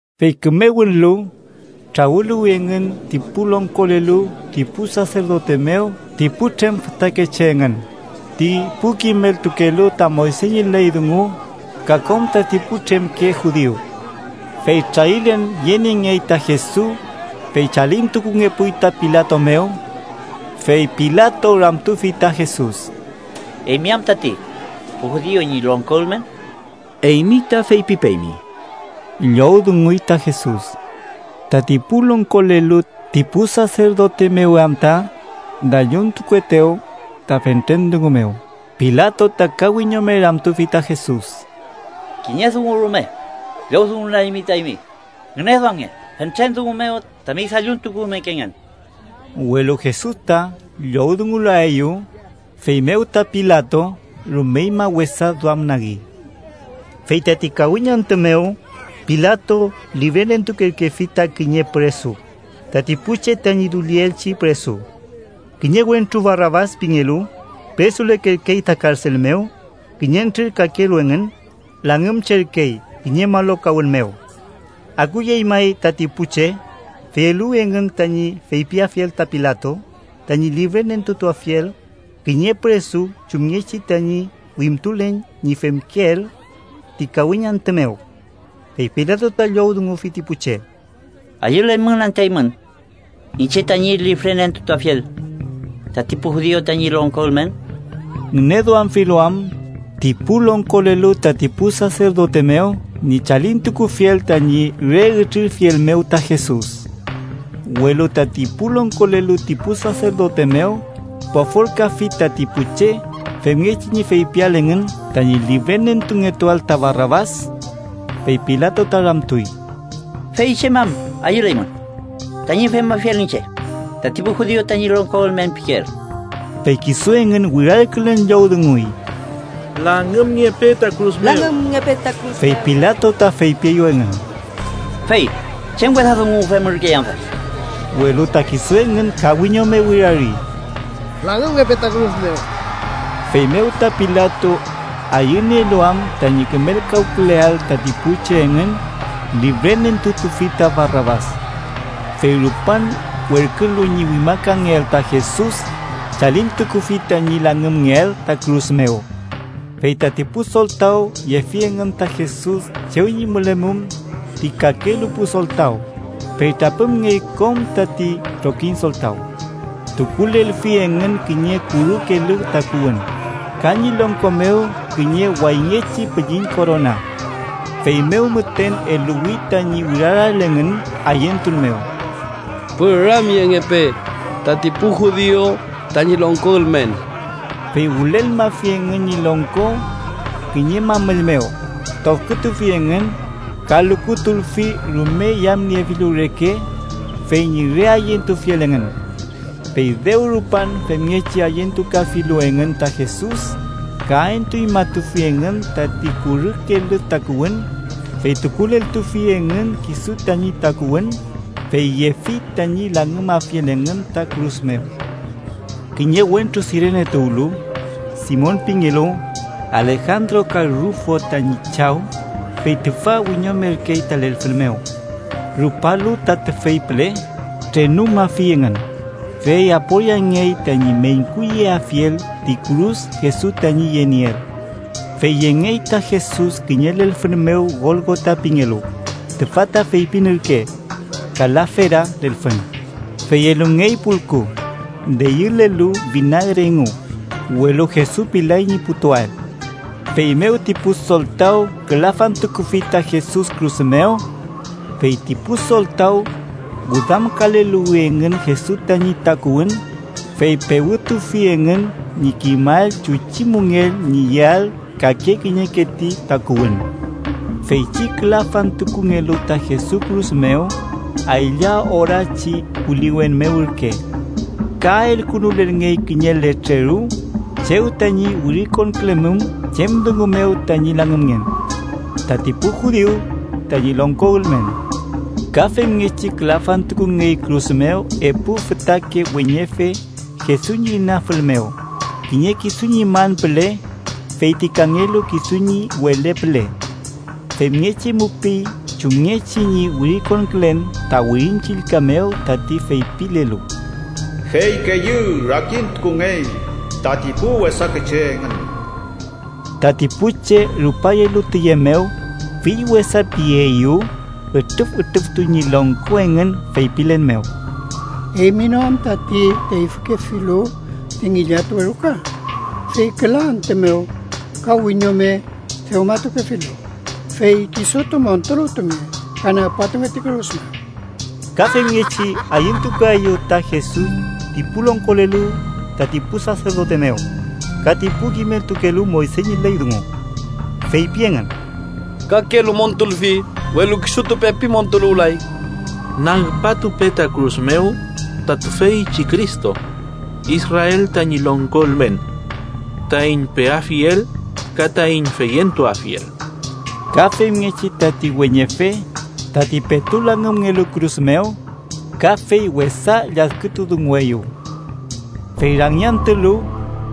Fey küme wünlu, trawüluwi engün ti pu longkolelu ti pu saserdote mew ti putrem fütakeche engün, ti pu kimeltukelu ta Moyse ñi ley dungu ka kom tati putremke judiu. Fey trarilen yeniengey ta Jesus, fey chalintukungepuy ta Pilato mew. Fey Pilato ramtufi ta Jesus: —¿Eymi am tati pu judiu ñi longko ülmen? —Eymi ta feypipeymi ―llowdunguy ta Jesus. Tati pu longkolelu ti pu saserdote mew am ta dalluntukuetew ta fentren dungu mew, Pilato ta ka wiñome ramtufi ta Jesus: —¿Kiñe dungu rume llowdungulaymi ta eymi? Ngüneduamnge fentren dungu mew tami dalluntukumekengen. Welu Jesus ta llowdungulaeyew, feymew ta Pilato rumeñma wesa duamnagi. Fey tati kawiñ antü mew, Pilato lifrenentukerkefi ta kiñe püresu, tati pu che tañi dullielchi püresu. Kiñe wentru Barabas pingelu püresulerkey ta karsel mew, kiñentrür kakelu engün langümcherkey kiñe malokawün mew. Akuyey may tati pu che, fey eluwi engün tañi feypiafiel ta Pilato tañi lifrenentutuafiel kiñe püresu chumngechi tañi wimtulen ñi femkeel ti kawiñ antü mew. Fey Pilato ta llowdungufi ti pu che: —¿Ayüleymün anta eymün iñche tañi lifrenentutuafiel tati pu judiu tañi longko ülmen?― ngüneduamfilu am ti pu longkolelu tati pu saserdote mew ñi chalintukufiel tañi re ütrirfiel mew ta Jesus. Welu tati pu longkolelu ti pu saserdote mew pofolkafi tati pu che, femngechi ñi feypiael engün tañi lifrenentungetuael ta Barabas. Fey Pilato ta ramtuy: —¿Fey chem am ayüleymün tañi femafiel iñche tati pu judiu tañi longko ülmen pikeel? Fey kisu engün wirarkülen llowdunguy: —¡Langümngepe ta kürus mew! Fey Pilato ta feypieyew engün: —Fey ¿chem wesa dungu femürkey amfe? Welu ta kisu engün ka wiñome wirari: —¡Langümngepe ta kürus mew! Feymew ta Pilato, ayünielu am tañi kümelkawküleael tati pu che engün, lifrenentutufi ta Barabas. Fey rupan werkülu ñi wimakangeael ta Jesus, chalintukufi tañi langümngeael ta kürus mew. Fey tati pu soltaw yefi engün ta Jesus chew ñi mülemum ti kakelu pu soltaw, fey trapümngey kom tati trokiñ soltaw. Tukulelfi engün kiñe kurü kelü takuwün, ka ñi longko mew kiñe wayngechi pülliñ korona. Feymew müten eluwi tañi wirarael engün ayentun mew: —¡Püramyengepe tati pu judiu tañi longko ülmen! Fey wülelmafi engün ñi longko kiñe mamüll mew, tofkütufi engün, ka lukutulfi rume yamniefilu reke, fey ñi re ayentufiel engün. Fey dew rupan femngechi ayentukafilu engün ta Jesus, ka entuñmatufi engün tati kurü kelü takuwün, fey tukuleltufi engün kisu tañi takuwün, fey yefi tañi langümafiel engün ta kürus mew. Kiñe wentru Sirene tuwlu, Simon pingelu, Alejandro ka Rufo tañi chaw, fey tüfa wiñomerkey ta lelfün mew. Rupalu ta tüfey püle, trenumafi engün, fey aporiangey tañi meñkuyeafiel ti kürus Jesus tañi yenieel. Fey yengey ta Jesus kiñe lelfün mew Golgota pingelu (tüfa ta feypin ürke: “Kalafera lelfün”), fey elungey pulku deyülelu finagre engu, welu Jesus pilay ñi putuael. Feymew ti pu soltaw külafantukufi ta Jesus kürus mew. Fey ti pu soltaw wüdamkaleluwi engün Jesus tañi takuwün, fey pewütufi engün ñi kimael chuchi müngell ñi yeael kake kiñeke ti takuwün. Feychi külafantukungelu ta Jesus kürus mew, aylla orachi puliwen mew ürke. Ka elkünulelngey kiñe letreru chew tañi wirikonkülemum chem dungu mew tañi langümngen: TATI PU JUDIU TAÑI LONGKO ÜLMEN. Ka femngechi külafantukungey kürus mew epu fütrake weñefe Jesus ñi inafül mew, kiñe kisu ñi man püle fey ti kangelu kisu ñi wele püle. Femngechi mupiy chumngechi ñi wirikonkülen ta Wirin Chillka mew tati feypilelu: “fey keyü rakintukungey tati pu wesake che engün.” Tati pu che rupayelu tiye mew, fill wesapieyew. Ütrüfütrüftuy ñi longko engün feypilen mew: —¡Eymi no am tati teyfükefilu ti ngillatuwe ruka, fey küla antü mew ka wiñome dewmatukefilu, fey kisutu montuluwtunge ka nagpatunge ti kürus mew! Ka femngechi ayentukaeyew ta Jesus ti pu longkolelu tati pu saserdote mew ka ti pu kimeltukelu Moyse ñi ley dungu. Feypi engün: —Kakelu montulfi, welu kisutu pepi montuluwlay. ¡Nagpatupe ta kürus mew ta tüfeychi Cristo, Israel tañi longko ülmen, taiñ peafiel ka taiñ feyentuafiel! Ka femngechi tati weñefe tati petu langümngelu kürus mew, kafey wesa lladkütudungueyew. Fey rangiantülu,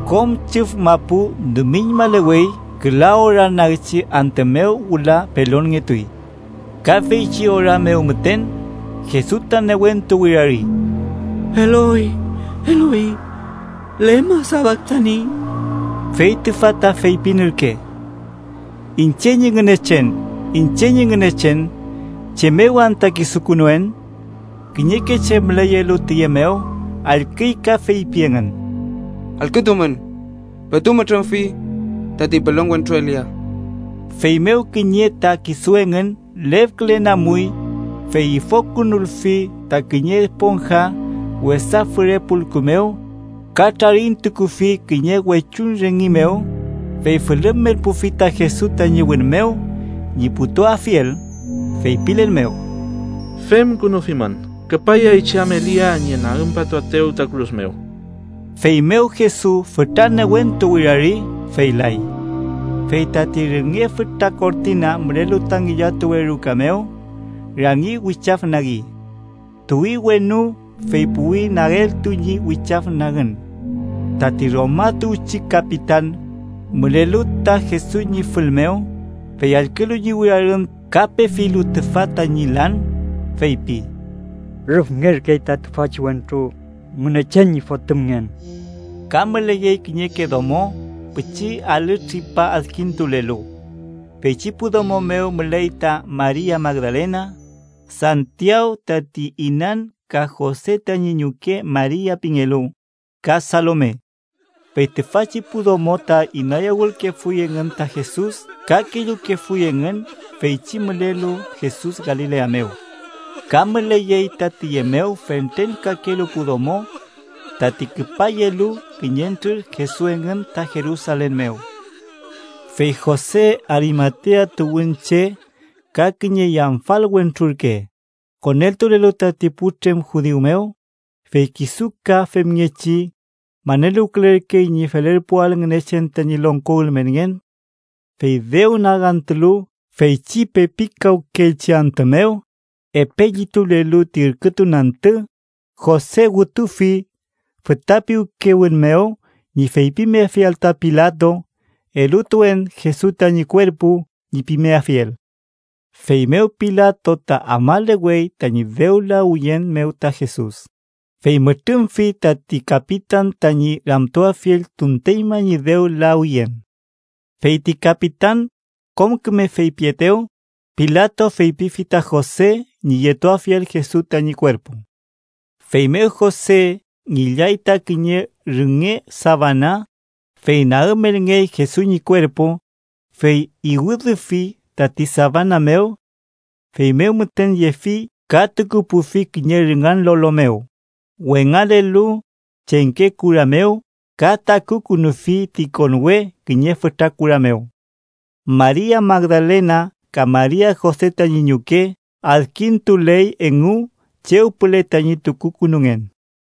kom chüf mapu dumiñmalewey küla ora nagchi antü mew wüla pelonngetuy. Ka feychi ora mew müten, Jesus ta newentu wirari: “Eloy Eloy, ¿lema safaktani?” (Fey tüfa ta feypin ürke: “iñche ñi Ngünechen, iñche ñi Ngünechen, ¿chem mew anta kisukünuen?”) Kiñeke che müleyelu tiye mew, allküy ka feypi engün: —Allkütumün. Petu mütrümfi tati pelon wentru Elia. Feymew kiñe ta kisu engün lefkülen amuy, fey ifokünulfi ta kiñe esponja wesa füre pulku mew ka trarintukufi kiñe wechuñ rüngi mew, fey fülümelpufi ta Jesus tañi wün mew ñi putuafiel, feypilen mew: —Femkünufimün, küpayay chey am Elia ñi nagümpatuaetew ta kürus mew. Feymew Jesus fütra newentu wirari, fey lay. Fey tati rünge fütra kortina mülelu ta ngillatuwe ruka mew, rangi wichafnagi. Tuwi wenu, fey puwi nageltu ñi wichafnagün. Tati Roma tuwchi kapitan, mülelu ta Jesus ñi fül mew, fey allkülu ñi wirarün ka pefilu tüfa tañi lan, feypi: —Rüfngerkey ta tüfachi wentru Ngünechen ñi Fotümngen. Ka müleyey kiñeke domo pichi alü tripa adkintulelu. Feychi pu domo mew müley ta Maria Magdalena, Santiaw tati inan ka Jose tañi ñuke Maria pingelu, ka Salome. Fey tüfachi pu domo ta inayawülkefuy engün ta Jesus ka kellukefuy engün feychi mülelu Jesus Galilea mew. Ka müleyey ta tiye mew fentren kakelu pu domo tati küpayelu kiñentrür Jesus engün ta Jerusalen mew. Fey Jose, Arimatea tuwünche ka kiñe yamfal wentru ürke, koneltulelu tati putremke judiu mew, fey kisu ka femngechi maneluwkülerkey ñi felerpuael Ngünechen tañi longko ülmenngen. Fey dew nagantülu feychi pepikawkeelchi antü mew, epe llitulelu ti ürkütun antü, Jose wütufi füta piwkewün mew ñi feypimeafiel ta Pilato “elutuen Jesus tañi kuerpu” ñi pimeafiel. Feymew Pilato ta afmalewey tañi dew lawiyen mew ta Jesus, fey mütrümfi tati kapitan tañi ramtuafiel tunteñma ñi dew lawiyen. Fey ti kapitan kom küme feypietew, Pilato feypifi ta Jose ñi yetuafiel Jesus tañi kuerpu. Feymew Jose ngillay ta kiñe rünge safana, fey nagümelngey Jesus ñi kuerpu, fey iwüdüfi tati safana mew. Feymew müten yefi ka tukupufi kiñe rüngan lolo mew wengalelu chengke kura mew ka takukünufi ti konwe kiñe fütra kura mew. Maria Magdalena ka Maria Jose tañi ñuke, adkintuley engu chew püle tañi tukukünungen.